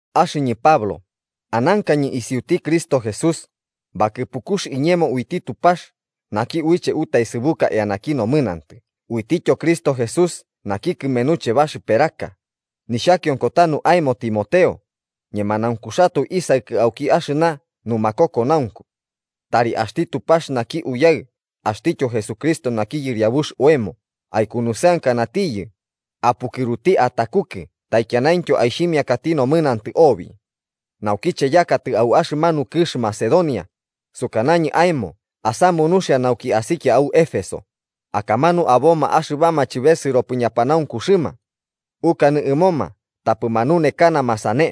Axɨñɨ Pablo, anankañɨ isiuti Cristo Jesús, bakɨpukux iñemo uiti Tupax, naki uiche utaesɨbuka eanaki nomɨnantɨ uitityo Cristo Jesús, naki kɨmenuche baxɨperaka, nixhakionko tanu aemo Timoteo, ñemanaunkuxatoe isaɨkɨ auki axɨna numakokonaunku. Tari axti Tupax naki Uyaɨ axtityo Jesucristo naki yɨriabuxti oemo aikunusɨankanatiyɨ, apukɨruti atakukɨ taikianaintyo aixhimiakati nomɨnantɨ obi. Naukiche yakatɨ au axɨmanu kɨx Macedonia, sukanañɨ aemo asamu nuxia nauki asikia au Éfeso, akamanu aboma axɨbama chɨbesɨropɨ ñanunekakaxɨma. Ukanɨ ɨmoma tapɨ manunekakanama sane.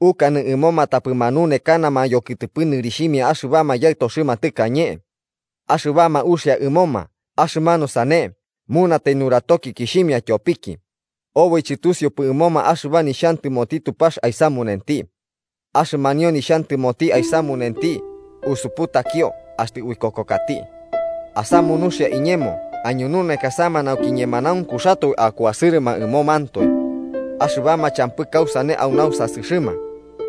Ukanɨ ɨmoma tapɨ manunekanama yokɨtɨpɨ nɨrixhimia axɨbama yaɨtoxɨma tɨkañe. Axɨbama uxia ɨmoma axɨmanu sane munatai nuratokikixhimia tyopiki, oboi chɨtusiupɨ ɨmoma axɨba nixhantɨmoti Tupax aisamunenti. Axɨmanio nixhantɨmoti aisamunenti usuputakio axtɨ uikokokati. Asamu nuxia iñemo aiñununekasama nauki ñemanaunkuxatoe akuasɨrɨma ɨmomantoe. Axɨbama champɨ kausane au nausasɨxɨma,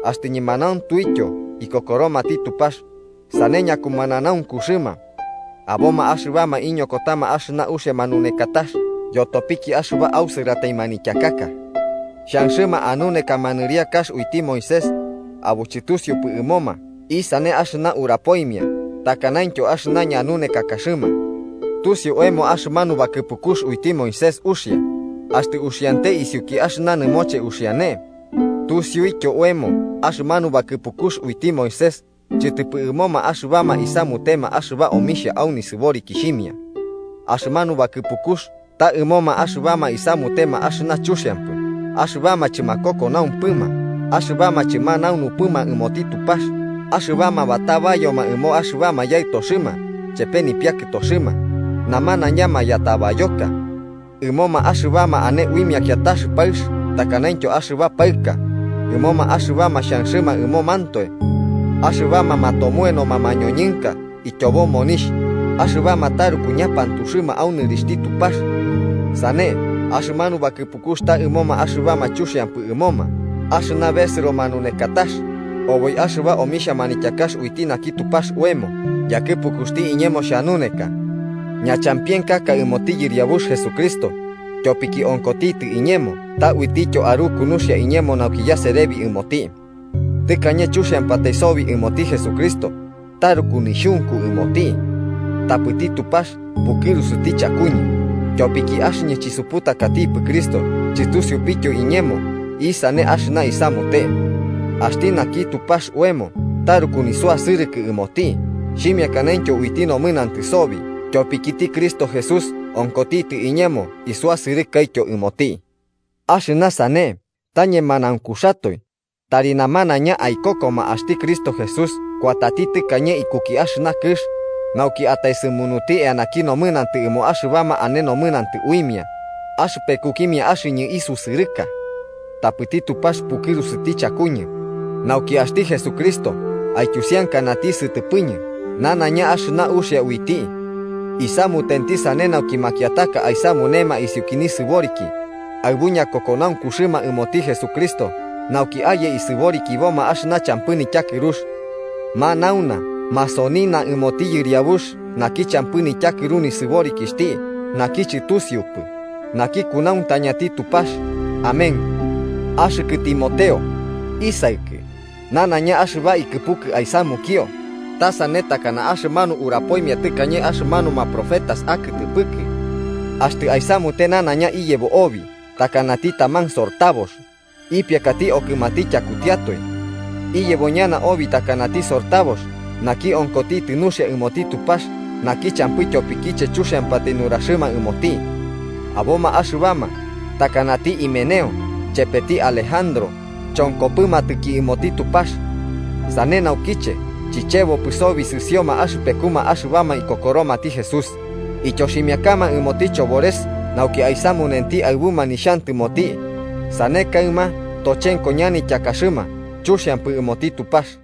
axtɨ ñemanauntuityo ikokoromati Tupax, sane ñakumananaunkuxɨma. Aboma axɨbama iñokotama axɨna uxia manunekatax yotopiki axɨba ausɨratai manityakaka. Xhanxɨma anunekama nɨriakax uiti Moisés, abo chɨtusiupɨ ɨmoma isane axɨna urapoimia takanaintyo axɨna ñanunekakaxɨma. Tusiu oemo axɨmanu bakɨpukux uiti Moisés uxia, axtɨ uxiante isiuki axɨna nɨmoche uxiane. Tusiuityo oemo axɨmanu bakɨpukux uiti Moisés chɨtɨpɨ ɨmoma axɨbama isamutema axɨba omixhia au nisɨborikixhimia. Axɨmanu bakɨpukux ta ɨmoma axɨbama isamutema axɨna chuxiampɨ axɨbama chɨmakokonaumpɨma, axɨbama chɨmanaunupɨma ɨmoti Tupax, axɨbama batabayoma ɨmo axɨbama, yaɨtoxɨma chepe nipiakɨtoxɨma, namanaiña mayatabayoka. Ɨmoma axɨbama ane uimia kiatax paɨx takanaintyo axɨba paɨka, ɨmoma axɨbama xhanxɨma ɨmomantoe. Axɨbama matomoenoma mañoñɨnka ityobo monixh, axɨbama taruku ñapantuxɨma au nɨrixhti Tupax. Sane, axɨmanu bakɨpukux ta ɨmoma axɨbama chuxiampɨ ɨmoma axɨna besɨro manunekatax, oboi axɨba omixhia manityakax uiti naki Tupax oemo yakɨpukuxti iñemo xhanuneka. Ñachampienkaka ɨmoti Yɨriabux Jesucristo, tyopiki onkotitɨ iñemo ta uitityo aruku nuxia iñemo nauki yaserebi ɨmoti. Tɨkañe chuxiampatai sobi ɨmoti Jesucristo, taruku nixhunku ɨmoti. Tapɨti Tupax pukɨrusuti chakuñɨ, tyopiki axɨñɨ chisuputakatikipɨ Cristo chɨtusiupɨtyo iñemo isane axɨna isamute. Axti naki Tupax oemo taruku nisuasɨrɨkɨ ɨmoti xhimiakanaintyo uiti nomɨnantɨ sobi: tyopikiti Cristo Jesús onkotitɨ iñemo isuasɨrɨkaityo ɨmoti. Axɨna sane ta ñemanaunkuxatoe, tari namanaiña aikokoma: axti Cristo Jesús kuatati tɨkañe iku axɨna kɨx, nauki ataesɨmunuti eanaki nomɨnantɨ ɨmo axɨbama ane nomɨnantɨ uimia, axɨpekukimia axɨñɨ isusɨrɨka. Tapɨti Tupax pukɨrusuti chakuñɨ, nauki axti Jesucristo aityusiankati sɨtɨpɨkiñɨ nanaiña axɨna uxia uiti. Isamutenti sane nauki makiataka aisamunema isiuki nisɨboriki aɨbu ñakokonaunkuxɨma ɨmoti Jesucristo nauki aye isɨborikiboma axɨna champɨ nityakɨrux. ¡Manauna masonina ɨmoti Yɨriabux naki champɨ nityakɨru nisɨborikixhti, naki chɨtusiutipɨ, naki kunauntañati Tupax! Amén. Axɨkɨ Timoteo, isaɨkɨ, nanaiña axɨba ikɨpukɨ aisamunio ta sane takana axɨmanu urapoimia tɨkañe axɨmanuma profetas akɨtɨpɨkɨ. Axtɨ aisamute nanaiña iyebo obi takanati taman sortabox ipiakati okɨmati tyakutiatoe. Iyebo ñana obi takanati sortabox naki onkotitɨ nuxia ɨmoti Tupax naki champɨ tyopikiche chuxiampatai nuraxɨma ɨmoti. Aboma axɨbama, takanati Himeneo chepeti Alejandro, chonkopɨmatɨki ɨmoti Tupax. Sane naukiche chichebopɨ sobi sɨsioma axɨpekuma axɨbama ikokoromati Jesús, ityoximiakama ɨmoti chobores nauki aisamunenti aɨbuma nixhantɨmoti, sane kaɨma tochenko ñanityakaxɨma chuxiampɨ ɨmoti Tupax.